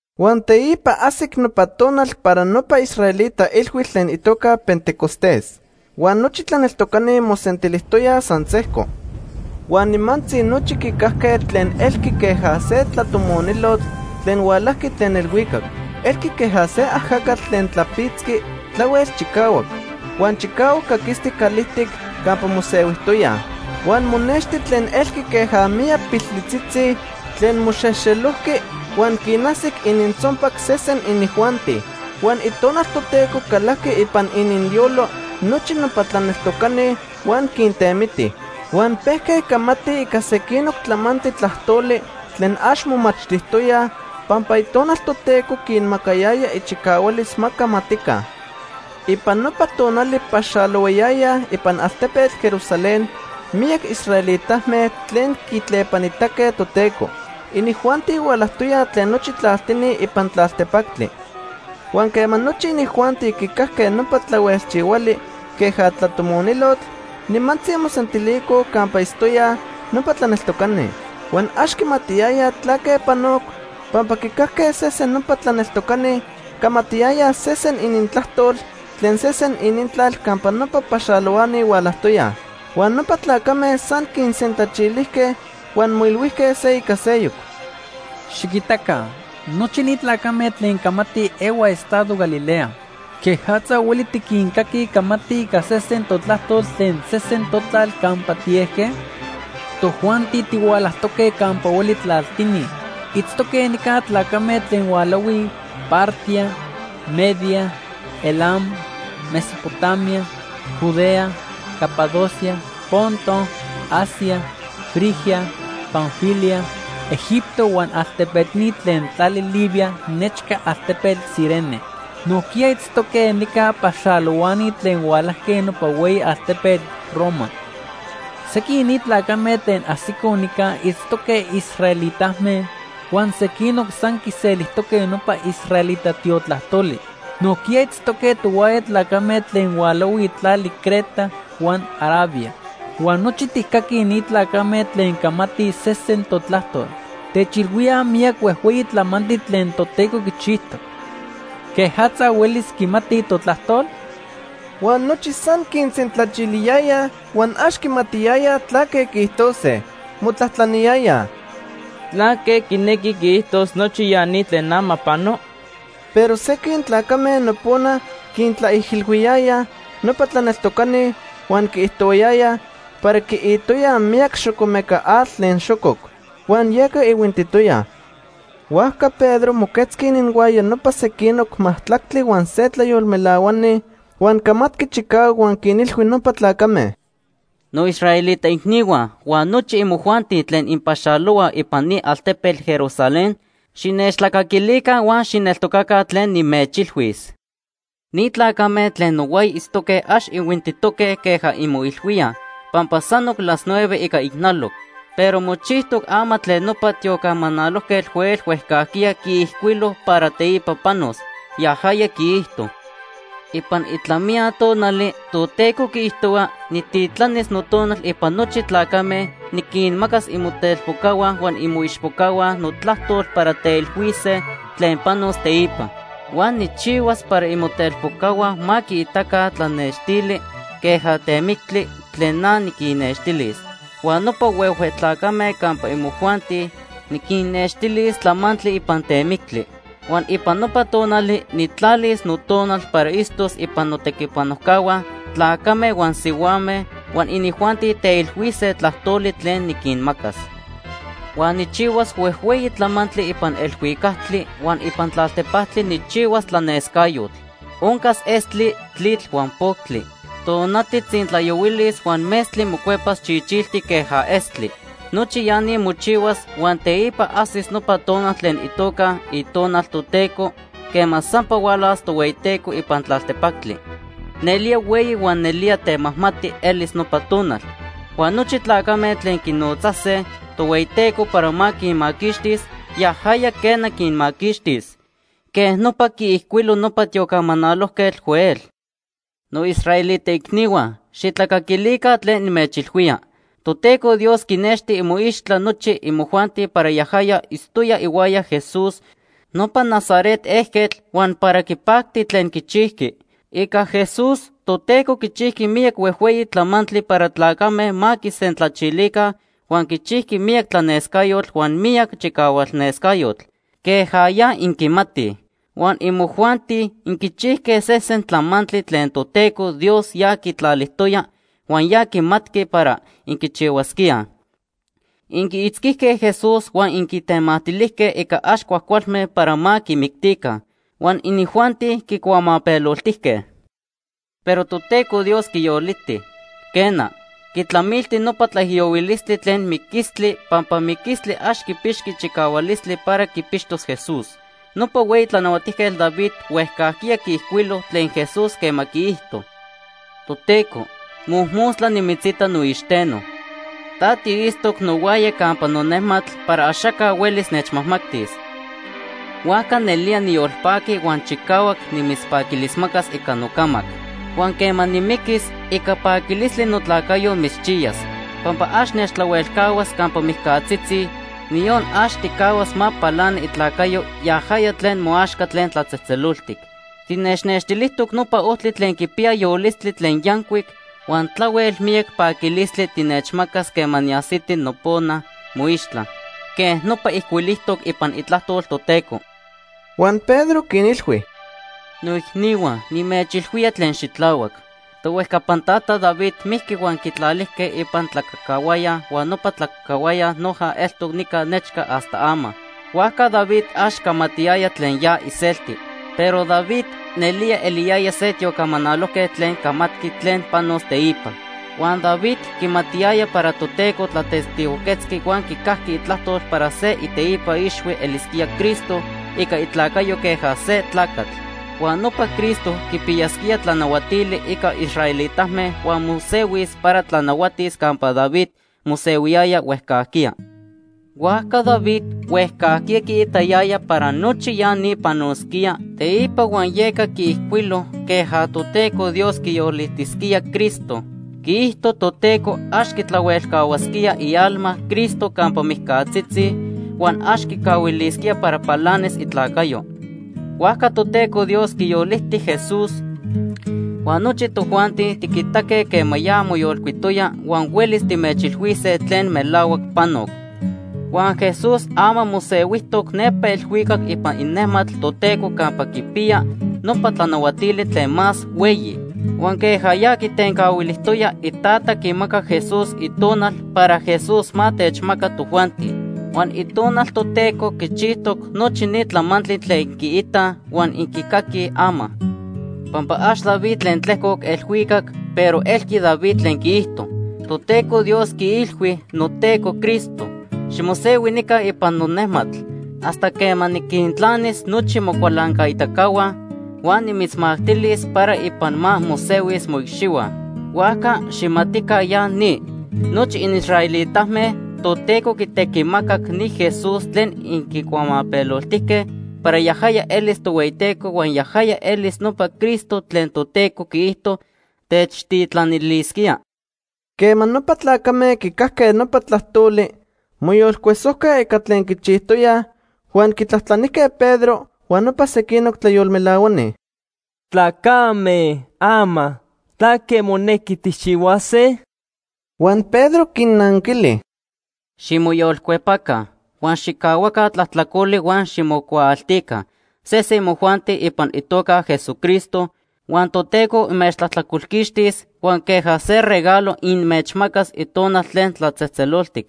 Huan teipa ajsic nopa tonal para nopa israelita ilhuitl tlen itoca Pentecostés. Huan nochi tlaneltocani mosentilijtoyaj san sejco. Huan nimantzi nochi quicajque tlen elqui queja se tlatomonilotl tlen hualajqui tlen elhuicac. Elqui queja se ajacatl tlen tlapitzqui tlahuel chicahuac. Huan chicahuac caquistic calijtic campa mosehuijtoyaj. Huan monexti tlen elqui queja miyac piltlitzitzi tlen moxejxelojqui huan quinajsic inintzonpac sesen inijuanti. Huan Itonal Toteco calajqui ipan ininyolo nochi nopa tlaneltocani huan quintemiti. Huan pejque camatij ica sequinoc tlamantli tlajtoli tlen ax momachtijtoyaj pampa Itonal Toteco quinmacayaya ichicahualis ma camatica. Ipan nopa tonali paxalohuayayaj ipan altepetl Jerusalén miyac israelitame tlen quitlepanitaque Toteco. Inijuanti hualajtoyaj tlen nochi tlaltini ipan tlaltepactli. Huan quema nochi inijuanti quicajque nopa tlahuelchihuali queja tlatomonilotl, nimantzi mosentilicoj campa itztoyaj nopa tlaneltocani. Huan ax quimatiyayaj tlaque panoc, pampa quicajque sesen nopa tlaneltocani camatiyayaj sesen inintlajtol tlen sesen inintlal campa nopa paxalohuani hualajtoyaj. Huan nopa tlacame san quinsentlachilijque huan moilhuijque se ica seyoc: ―Xiquitaca, nochi ni tlacame tlen camatij ehuaj estado Galilea. ¿Quejatza hueli tiquincaquij camatij ica sesen totlajtol tlen sesen totlal campa tiejque? Tojuanti tihualajtoque campa hueli tlaltini. Itztoque nica tlacame tlen hualahuij: Partia, Media, Elam, Mesopotamia, Judea, Capadocia, Ponto, Asia, Frigia, Panfilia, Egipto huan altepetini tlen tlali Libia nechca altepetl Cirene. Nojquiya itztoque nica paxalohuani tlen hualajque nopa hueyi altepetl Roma. Sequin ni tlacame tlen ajsicoj nica itztoque israelitame, huan sequinoc san quiselijtoque nopa israelita tiotlajtoli. Nojquiya itztoque tohuaya tlacame tlen hualahuij tlali Creta huan Arabia. Huan nochi tijcaquij ni tlacame tlen camatij sesen totlajtol. Techilhuíaj miyac huejhueyi tlamantli tlen Toteco quichijtoc. ¿Quejatza huelis quimatij totlajtol? Huan nochi san quinsentlachiliyayaj huan ax quimatiyayaj tlaque quiijtose. Motlajtlaniyayaj: ―¿Tlaque quinequi quiijtos nochi ya ni tlen ama pano? Pero sequin tlacame nopona quintlaijilhuiyayaj nopa tlaneltocani huan quiijtohuayayaj para quiitoyaj miyac xocomeca atl tlen xococ, huan yeca ihuintitoyaj. Huajca Pedro moquetzqui ininhuaya nopa sequinoc majtlactli huan se tlayolmelahuani, huan camatqui chicahuac huan quinilhui nopa tlacame: “Noisraelita icnihua huan nochi imojuanti tlen inpaxalohuaj ipan ni altepetl Jerusalén, xinechtlacaquilica huan xijneltocaca tlen nimechilhuis. Ni tlacame tlen nohuaya itztoque ax ihuintitoque queja inmoilhuíaj, pampa sanoc las nueve ica ijnaloc. Pero mochijtoc ama tlen nopa tiocamanalojquetl Joel huejcajquiya quiijcuilo para teipa panos. Yajaya quiijto: ‘Ipan itlamiya tonali, Toteco quiijtohua, nijtitlanis Notonal ipan nochi tlacame. Niquinmacas imotelpocahua huan imoichpocahua notlajtol para teilhuise tlen panos teipa. Huan nijchihuas para imotelpocahua ma quiitaca tlanextili queja temictli tlen na niquinnextilis, huan nopa huehue tlacame campa imojuanti, niquinnextilis tlamantli ipan temictli. Huan ipan nopa tonali nijtlalis Notonal para itztos ipan notequipanojcahua, tlacame huan sihuame, huan inijuanti teilhuise tlajtoli tlen niquinmacas. Huan nijchihuas huejhueyi tlamantli ipan elhuicactli. Huan ipan tlaltepactli nijchihuas tlanescayotl. Oncas estli, tlitl huan poctli. Tonati tzintlayohuilis huan metztli mocuepas chichiltic queja estli. Nochi ya ni mochihuas, huan teipa ajsis nopa tonal tlen itoca “itonal Toteco” quema sampa hualas Tohueyiteco ipan tlaltepactli. Nelía hueyi huan nelía temajmati elis nopa tonal. Huan nochi tlacame tlen quinotzase Tohueyiteco para ma quinmaquixtis, yajaya, quena, quinmaquixtis.’ Quej nopa quiijcuilo nopa tiocamanalojquetl Joel. “Noisraelita icnihua, xijtlacaquilica tlen nimechilhuía. Toteco Dios quinexti imoixtla nochi imojuanti para yajaya itztoya ihuaya Jesús, nopa Nazaret ejquetl, huan para quipacti tlen quichijqui. Ica Jesús, Toteco quichijqui miyac huejhueyi tlamantli para tlacame ma quisentlachilica huan quichijqui miyac tlanescayotl huan miyac chicahualnescayotl, queja ya inquimatij. Huan imojuanti inquichijque sesen tlamantli tlen Toteco Dios ya quitlalijtoya huan ya quimatqui para inquichihuasquíaj. Inquiitzquijque Jesús huan inquitemactilijque ica ax cuajcualme para ma quimictica, huan inijuanti quicuamapeloltijque. Pero Toteco Dios quiyoliti. Quena, quitlamilti nopa tlaijiyohuilistli tlen miquistli pampa miquistli ax quipixqui chicahualistli para quipixtos Jesús. Nopa hueyi tlanahuatijquetl David huejcajquiya quiijcuilo tlen Jesús quema quiijto: ‘Toteco, mojmostla nimitzita noixteno. Ta tiitztoc nohuaya campa nonejmatl para axaca huelis nechmajmatis. Huajca nelía niyolpaqui huan chicahuac nimitzpaquilismacas ica nocamac. Huan quema nimiquis, ica paquilistli notlacayo mitzchiyas. Pampa ax nechtlahuelcahuas campa mijcatzitzi, niyon ax tijcahuas ma palani itlacayo yajaya tlen moaxca tlen tlatzejtzeloltic. Tinechnextilijtoc nopa ojtli tlen quipiya yolistli tlen yancuic, huan tlahuel miyac paquilistli tinechmacas quema niajsiti nopona moixtla.’ Quej nopa ijcuilijtoc ipan itlajtol Toteco.” Huan Pedro quinilhui: “Noicnihua, nimechilhuía tlen xitlahuac. Tohuejcapan tata David mijqui huan quitlalijque ipan tlacacahuaya huan nopa tlacacahuaya noja eltoc nica nechca hasta ama. Huajca David ax camatiyaya tlen ya iselti. Pero David nelía eliyaya se tiocamanalojquetl tlen camatqui tlen panos teipa. Huan David quimatiyaya para Toteco tlatestigojquetzqui huan quicajqui itlajtol para se iteipa ixhui elisquía Cristo ica itlacayo queja se tlacatl. Huan nopa Cristo quipiyasquía tlanahuatili ica israelitame huan mosehuis para tlanahuatis campa David mosehuiyaya huejcajquiya. Huajca David huejcajquiya quiitayaya para nochi ya ni panosquía teipa huan yeca quiijcuilo queja Toteco Dios quiyolitisquía Cristo. Quiijto Toteco ax quitlahuelcahuasquía ialma Cristo campa mijcatzitzi, huan ax quicahuilisquía para palanis itlacayo. Huajca Toteco Dios quiyoliti Jesús, huan nochi tojuanti tiquitaque quema ya moyolcuitoya huan huelis timechilhuise tlen melahuac panoc. Huan Jesús ama mosehuijtoc nepa elhuicac ipan inejmatl Toteco campa quipiya nopa tlanahuatili tlen más hueyi. Huan queja ya quitencahuilijtoya, Itata quimacac Jesús Itonal para Jesús ma techmaca tojuanti. Huan Itonal Toteco quichijtoc nochi ni tlamantli tlen inquiitaj huan inquicaquij ama. Pampa ax David tlen tlejcoc elhuicac, pero elqui David tlen quiijto: ‘Toteco Dios quiilhui noTeco Cristo: Ximosehui nica ipan nonejmatl, hasta quema niquintlanis nochi mocualancaitacahua, huan nimitzmactilis para ipan ma mosehuis moicxihua.’ “Huajca xijmatica ya ni, nochi inisraelitame, Toteco quitequimacac ni Jesús tlen inquicuamapeloltijque para yajaya elis Tohueyiteco huan yajaya elis nopa Cristo tlen Toteco quiijto techtitlanilisquía.” Quema nopa tlacame quicajque nopa tlajtoli, moyolcuesojque ica tlen quichijtoyaj, huan quitlajtlanijque Pedro huan nopa sequinoc tlayolmelahuani: ―Tlacame, ama ¿tlaque monequi tijchihuase? Huan Pedro quinnanquili: ―Ximoyolcuepaca huan xijcahuaca tlajtlacoli huan ximocuaaltica sesen imojuanti ipan itoca Jesucristo, huan Toteco inmechtlajtlacolquixtis huan queja se regalo inmechmacas Itonal tlen tlatzejtzeloltic.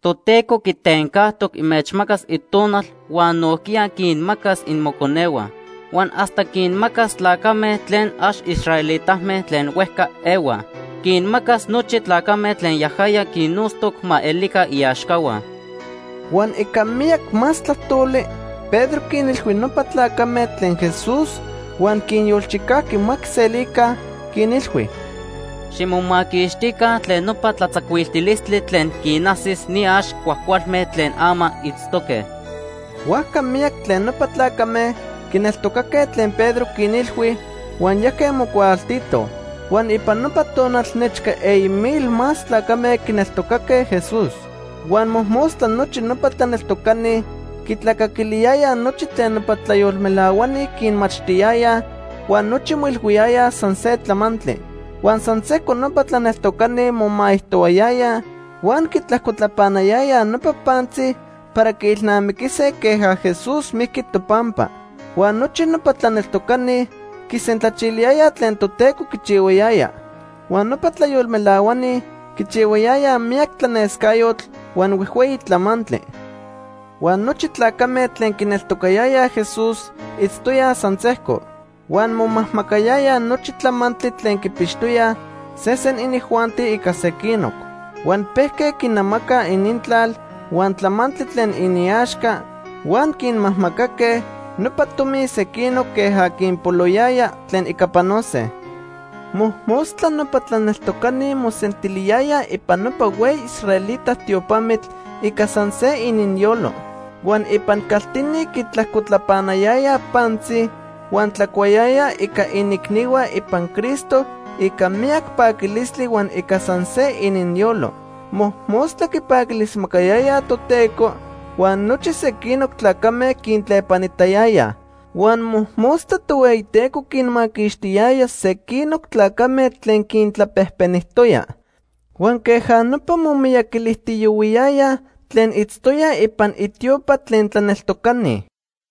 Toteco quitencajtoc inmechmacas Itonal huan nojquiya quinmacas imoconehua, huan hasta quinmacas tlacame tlen ax israelitame tlen huejca ehuaj. Quinmacas nochi tlacame tlen yajaya quinnotztoc ma elica iaxcahua. Huan ica miyac más tlajtoli Pedro quinilhui nopa tlacame tlen Jesús huan quinyolchicajqui ma quiselica, quinilhui: ―Ximomaquixtica tlen nopa tlatzacuiltilistli tlen quinajsis ni ax cuajcualme tlen ama itztoque. Huajca miyac tlen nopa tlacame quineltocaque tlen Pedro quinilhui, huan yajque mocuaaltitoj. Huan ipan nopa tonal nechca eyi mil más tlacame quineltocaque Jesús. Huan mojmostla nochi nopa tlaneltocani quitlacaquiliyayaj nochi tlen nopa tlayolmelahuani quinmachtiyayaj huan nochi moilhuiyayaj san se tlamantli. Huan san sejco nopa tlaneltocani momaijtohuayayaj huan quitlajcotlapanayayaj nopa pantzi para quiilnamiquise queja Jesús mijqui topampa. Huan nochi nopa tlaneltocani quisentlachiliyayaj tlen Toteco quichihuayaya. Huan nopa tlayolmelahuani quichihuayayaj miyac tlanescayotl huan huejhueyi tlamantli. Huan nochi tlacame tlen quineltocatoyaj Jesús itztoyaj san sejco. Huan momajmacayayaj nochi tlamantli tlen quipixtoyaj sesen inijuanti ica sequinoc. Huan pejque quinamacaj inintlal huan tlamantli tlen iniaxca huan quinmajmacaque nopa tomi sequinoc queja quinpoloyaya tlen ica panose. Mojmostla nopa tlaneltocani mosentiliyayaj ipan nopa hueyi israelita tiopamitl ica san se ininyolo. Huan ipan caltini quitlajcotlapanayayaj pantzi, huan tlacuayayaj ica iniicnihua ipan Cristo ica miyac paquilistli huan ica san se ininyolo. Mojmostla quipaquilismacayayaj Toteco, huan nochi sequinoc tlacame quintlepanitayayaj. Huan mojmostla Tohueyiteco quinmaquixtiyaya sequinoc tlacame tlen quintlapejpenijtoya. Huan queja nopa momiyaquilijtiyohuiyayaj tlen itztoyaj ipan itiopa tlen tlaneltocani.